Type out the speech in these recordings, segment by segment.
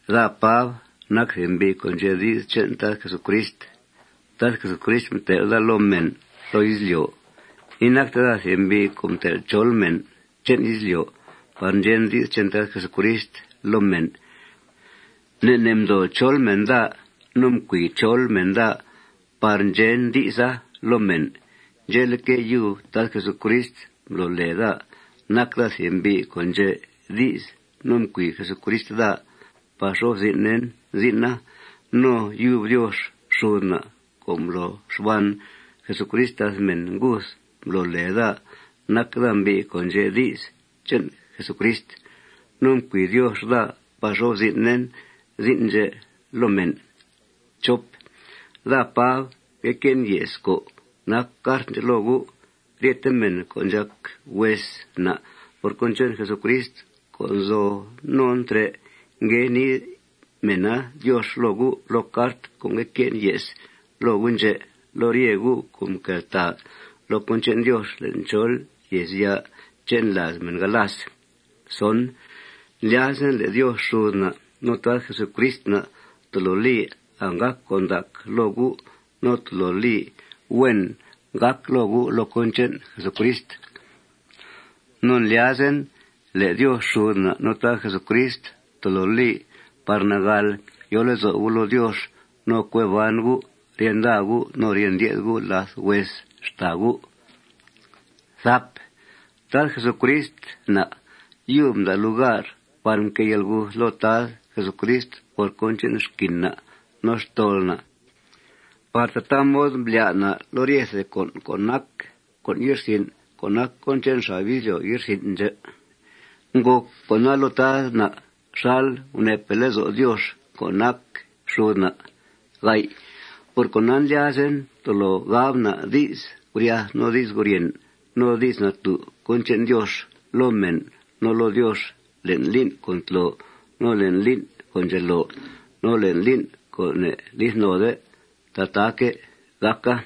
Daa, Pab, nac thìb mbi' co' ndxe' di's che'n Tad Jesucrist. Tad Jesucrist mtel' daa loo mèn loo izlyo'. Inacte daa thìb mbi' co' mtel' chol mèn che'n izlyo' par ndxen di's che'n Tad Jesucrist loo mèn. Ne' ne' mdoo chol mèn daa no mcui chol mèn daa par ndxen di'sa loo mèn. Ndxe'leque', yub Jesucrist mblo lèe daa nac daa thìb mbi' co' ndxe' di's no mcui Jesucrist daa par xo'f zin'en zin'a. No yub Diox xud na' co' mblo xban Jesucrist làth mèn nguth mblo lèe daa nac daa mbi' co' ndxe' di's che'n Jesucrist. No mcui Diox daa par xo'f zin'en zin' ndxè' loo mèn. Daa, Pab, ngue que'en ye's co' nac cart ndxè' loo gu'. Ryete mèn co' ndxàc hues na' por cón che'n Jesucrist co' nzo non trè', ngue nii mèna Diox loo gu' loo cart co' ngue que'en ye's loo gu' ndxè', loo rye gu' co' nqueltàa loo cón che'n Diox le'n chol yèezya' che'n làaz mèn galas. Ndlyazen le' Diox xud na' no Tad Jesucrist na' tolo li anggàc con' ndac loo gu' no tolo li huen gàca loo gu' loo cón che'n Jesucrist. No ndlyazen le' Diox xud na' no Tad Jesucrist tolo li par nagàl yo lezo' gu' loo Diox no cue ban gu' rye nda gu' no rye ndye'th gu' làth hues xtàa gu'. Tad Jesucrist na' yub mda' lugar par mquée yalguth loo Tad Jesucrist por cón che'n xquin na' no xtol na' par tataa mod mblyá' na' loo ryethe con' co' nac con' ye'rsin' co' nac che'n xab izlyo' ye'rsin' ndxè'. Ngòc con'a loo Tad na' xal guneepe' lezo' Diox co' nac xud na'. Por cona, ndlyazen tolo gab na' di's guryath no di's guryèn no di's natú' cón che'n Diox loo mèn no loo Diox le'n lín' co' ntlo, no le'n lín' co' ndxelo, no le'n lín' co' ne'lith node. Tataaque' gàca.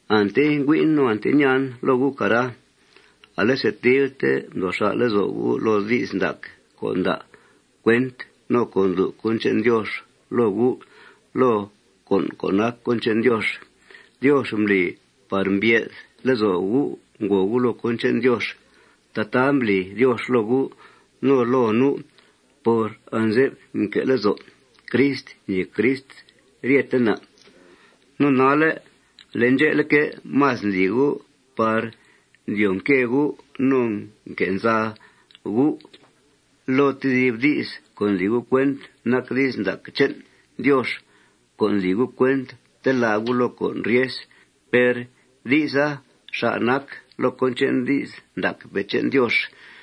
Ante ngüi'en no ante ñaan loo gu', cara, ale setilte mdoo xà' lezo' gu' loo di's ndac co' nda' cuent no co' ndlu' cón che'n Diox loo gu'. Loo con' co' nac cón che'n Diox, Diox mbli par mbye'th lezo' gu' ngòo gu' loo cón che'n Diox. Tataa mbli Diox loo gu', no loo nu', por anze'f mque'que' lezo' Crist ñèe Crist ryete na'. No nalle', ale ndxe'leque', más ndli gu' par ndyoo nque gu' no nque' nza gu' loo tedib di's co' ndli gu' cuent nac di's ndac che'n Diox, co' ndli gu' cuent telá' gu' loo con' ryes. Per di'sa xà' nac loo cón che'n di's ndacpe' che'n Diox.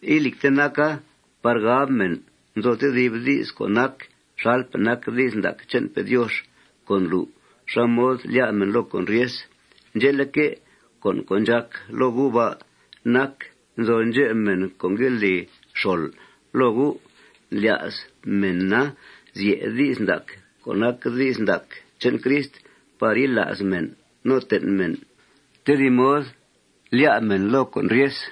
Ilìcte naca par gab mèn nzo tedib di's co' nac xalpe' nac di's ndac che'npe' Diox co' ndlu' xá mod lyá' mèn loo con' ryes. Ndxe'leque', con' co' ndxàc loo gu' ba' nac: Nzo ndxep mèn co' ngue li xol loo gu'. Ndlya's mèna zye' di's ndac, co' nac di's ndac che'n Crist, par yila's mèn no ten' mèn tedib mod lyá' mèn loo con' ryes.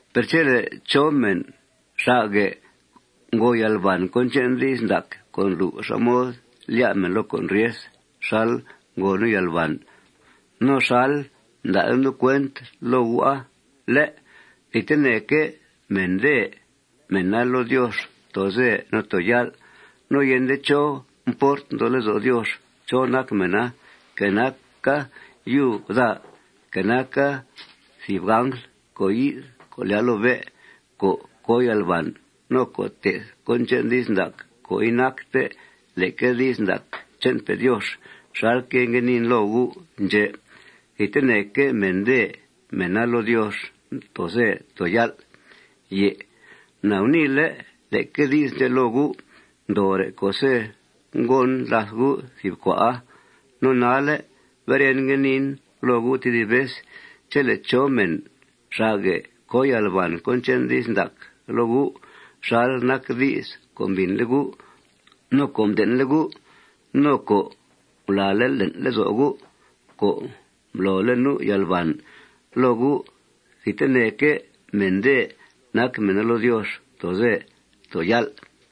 Per chele' chó mèn xà'guè' ngo yalbàn cón che'n di's ndac co' ndlu' xá mod lyá' mèn loo con' ryes xal ngo nu' yalbàn, no xal mda'le' nu' cuent loo gu'a, ¿lé'?, thidteneque' mèndèe mèna loo Diox too ze too yál'. No yende chó mport nzo lezo' Diox chó nac mèna, que naca yub daa, que naca thìb angl co' yi'th co' lyàa loo bé' co' co yalbàn no co' te'th cón che'n di's ndac co' inacte leque di's ndac che'npe' Diox xalque' ngue niin loo gu' ndxè', thidteneque' mèndèe mèna loo Diox too ze too yál'. Na guniile' leque di's ndxè' loo gu' ndoore' co'se' ngon làth gu' thìb cua'a. No nalle' beren, ngue niin loo gu' tedib vez: Chele' chó mèn xà'guè' co yalbàn cón che'n di's ndac loo gu' xal nac di's co' mbìnle' gu', no co' mden'le' gu', no co' ngulàale' le'n lezo' gu' co' mblole' nu' yalbàn loo gu', thidteneque' mèndèe nac mèna loo Diox too ze too yál'.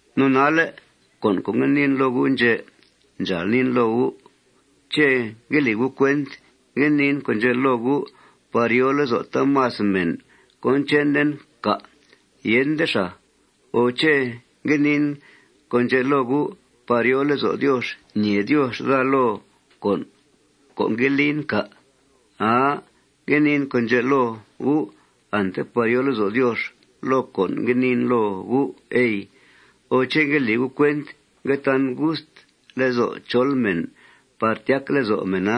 No nalle' con' co' ngue niin loo gu' ndxè' ndxàal niin loo gu': ¿Ché' ngue li gu' cuent ngue niin con' ndxè' loo gu' par yòo lezo' taamas mèn cón chenen, cà'? Yende xàa. O ¿ché' ngue niin con' ndxè' loo gu' par yòo lezo' Diox ñèe Diox daa loo con' co' ngue lin, cà'? Aa. Ngue niin con' ndxè' loo gu' ante par yòo lezo' Diox loo con' ngue niin loo gu', ey. O ¿ché' ngue li gu' cuent ngue tan gust lezo' chol mèn par tyac lezo' mèna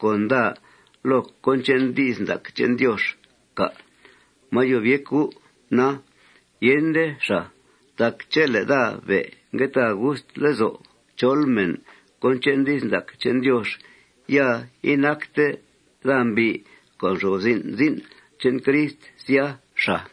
con daa loo cón che'n di's ndac che'n Diox, cà'? ¡Máa yob yéc gu', na! Yende xàa. Tac chele' daa be' ngue ta gust lezo' chol mèn cón che'n di's ndac che'n Diox, ya inacte daa mbi' co' nxo'f zin' zin' che'n Crist, sya, xàa.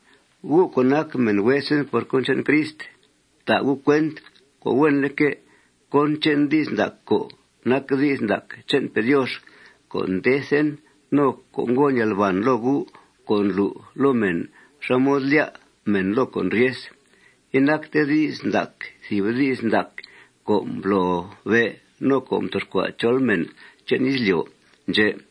Gu' co' nac mèn huesen por cón che'n Crist, fta' gu' cuent co' huenleque' cón che'n di's ndac co' nac di's ndac che'npe' Diox co' ndethen no co' ngon yalbàn loo gu' co' ndlu' loo mèn xá mod lyá' mèn loo con' ryes. Inacte di's ndaca thìb di's ndac co' mblobe' no co' mtoxcua' chol mèn che'n izlyo' ndxè'.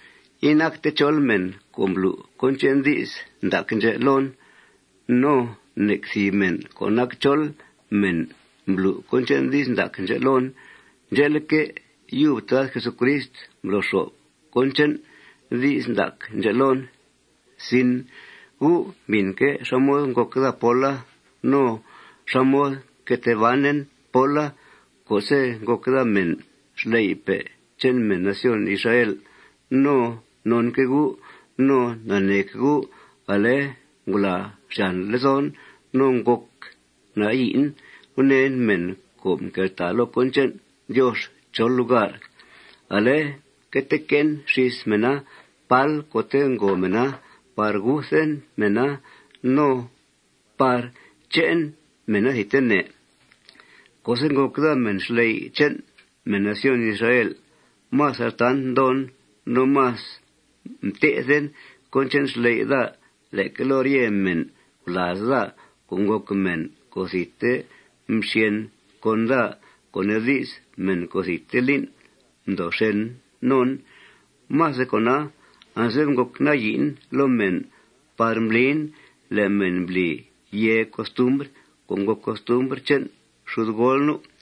Inacte chol mèn co' mblu' cón che'n di's ndac ndxè' loon. No nec thìb mèn co' nac chol mèn mblu' cón che'n di's ndac ndxè' loon. Ndxe'leque', yub Tad Jesucrist mblo xo'f cón che'n di's ndac ndxè' loon. Gu' mbìnque' xá mod ngòc daa póla no xá mod mque tee banen póla co'se' ngòc daa mèn xley'pe' che'n mèn nación Israel. No nonque' gu' no naneeque' gu', ale, ngulàa xyàn lezon no ngòc nayi'en gunèen mèn co' mqueltàa loo cón che'n Diox chol lugar. Ale mque tee que'en xís mèna pál co'te' ngo mèna par guthen mèna no par che'en mèna thidtene. Co'se' ngòc daa mèn xley' che'n mèn nación Israel, más altant mdoon no más mté'then cón che'n xley' daa leque loo rye mèn gulàaz daa co' ngòc mèn co' thidte mxyèn con daa, co' nee di's, mèn co' thidte lín' ndoo xèn non. Más de cona, anze'f ngòc nayi'en loo mèn par mblin le' mèn mbli yèe costumbr co' ngòc costumbr che'n xudgool nu'.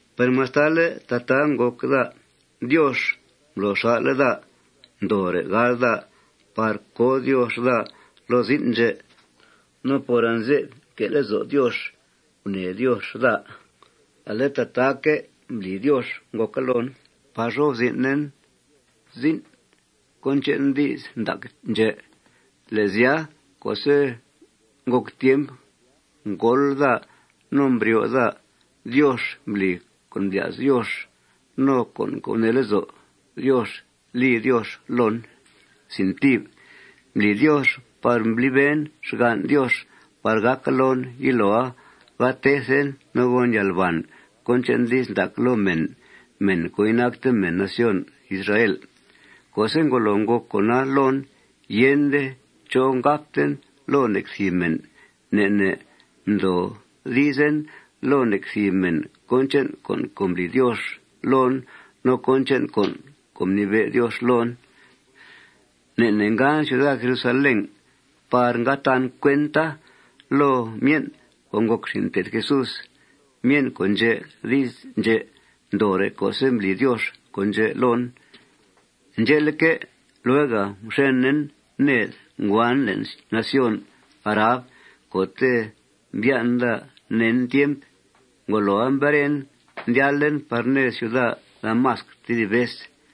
Per mastale' tataa ngòc daa, Diox mblo xà'le' daa ndoore' gáal daa par co Diox daa loo zin' ndxè'. No por anze'f nque' lezo' Diox gunèe Diox daa, ale tataaque' mbli Diox ngòca loon par xo'f zin'en cón che'n di's ndac ndxè'. Le' sya, co'se' ngòc tiemp ngóol daa no mbryoo daa, Diox mbli con' mblya's Diox no con' co' gunee lezo' Diox li Diox loon. Mbli Diox par mbliben xgan' Diox par gàca loon yiloa ga tethen no gon yalbàn cón che'n di's ndac loo mèn, mèn co' inacte mèn nación Israel. Co'se' ngolo ngòc con'a loon, yende chó ngabten loo nec thìb mèn. Ne' ne' mdoodizen loo nec thìb mèn cón che'n con' co' mbli Diox loon no cón che'n con' co' mnibe' Diox loon. Ne' ne' ngan ciuda Jerusalén par nga tan cuenta loo myen' co' ngòc xin' mté'th Jesús, myen' co' ndxe' di's ndxè' ndoore' co'se' mbli Diox con' ndxè' loon. Ndxe'leque', luega mxenen ned. Nguan le'n nación Arab co'te' mbyan' daa nen tiemp. Ngoloa, mberen, ndyalen par ned ciuda Damasc tedib vez.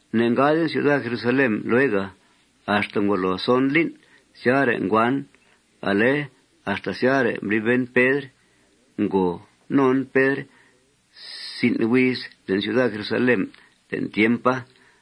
Ne'ngaden ciuda Jerusalén luega. Axta ngolo son lín', syare' nguan. Ale axta syare' mbliben Pedr. Ngo non Pedr si'n huiz le'n ciuda Jerusalén le'n tiempa.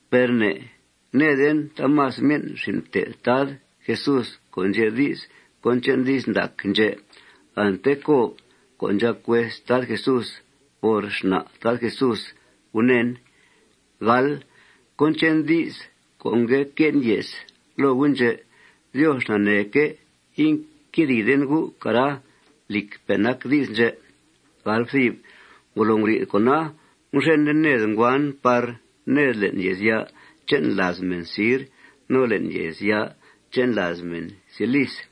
Per ne'ngnèeden taamas myen' xin' mté'th Tad Jesús co' ndxe' di's cón che'n di's ndac ndxè'. Ante Cob co' ndxàc hues Tad Jesús por xna' Tad Jesús gunèen. Cón che'n di's co' ngue que'en ye's loo gu' ndxè', Diox naneeque' inquedìiden gu', cara. Lìcpe' nac di's ndxè'. Ngolo nguri'th con'a, mxenen ned. Nguan par ned le'n yèezya' che'n làaz mèn sir no le'n yèezya' che'n làaz mèn cilis.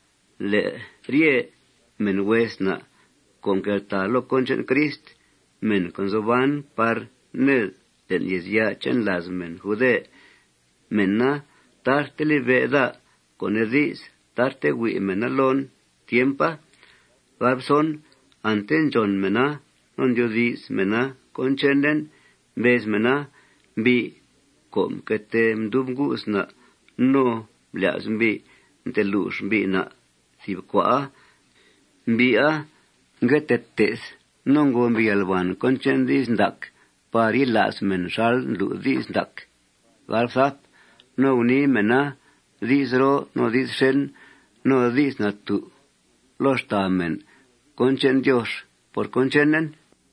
Le' rye mèn hues na' co' nqueltàa loo cón che'n Crist, mèn co' nzo ban par ned le'n yèezya' che'n làaz mèn jude, mèna tarte libe' daa, co' nee di's, tarte hui' mèna loon tiempa. Ante ndxòn mèna no ndyoodi's mèna cón chenen. Mbez mèna: Mbi' co' mque tee mdub ngu's na' no mblya's mbi' mtelux mbi' na' thìb cua'a, mbi'a ngue tee te'th no ngo mbi' yalbàn cón che'n di's ndac par yila's mèn xal ndlu' di's ndac. No gunii mèna di's roo no di's xèn no di's natú' loo xtàa mèn cón che'n Diox por cón chenen.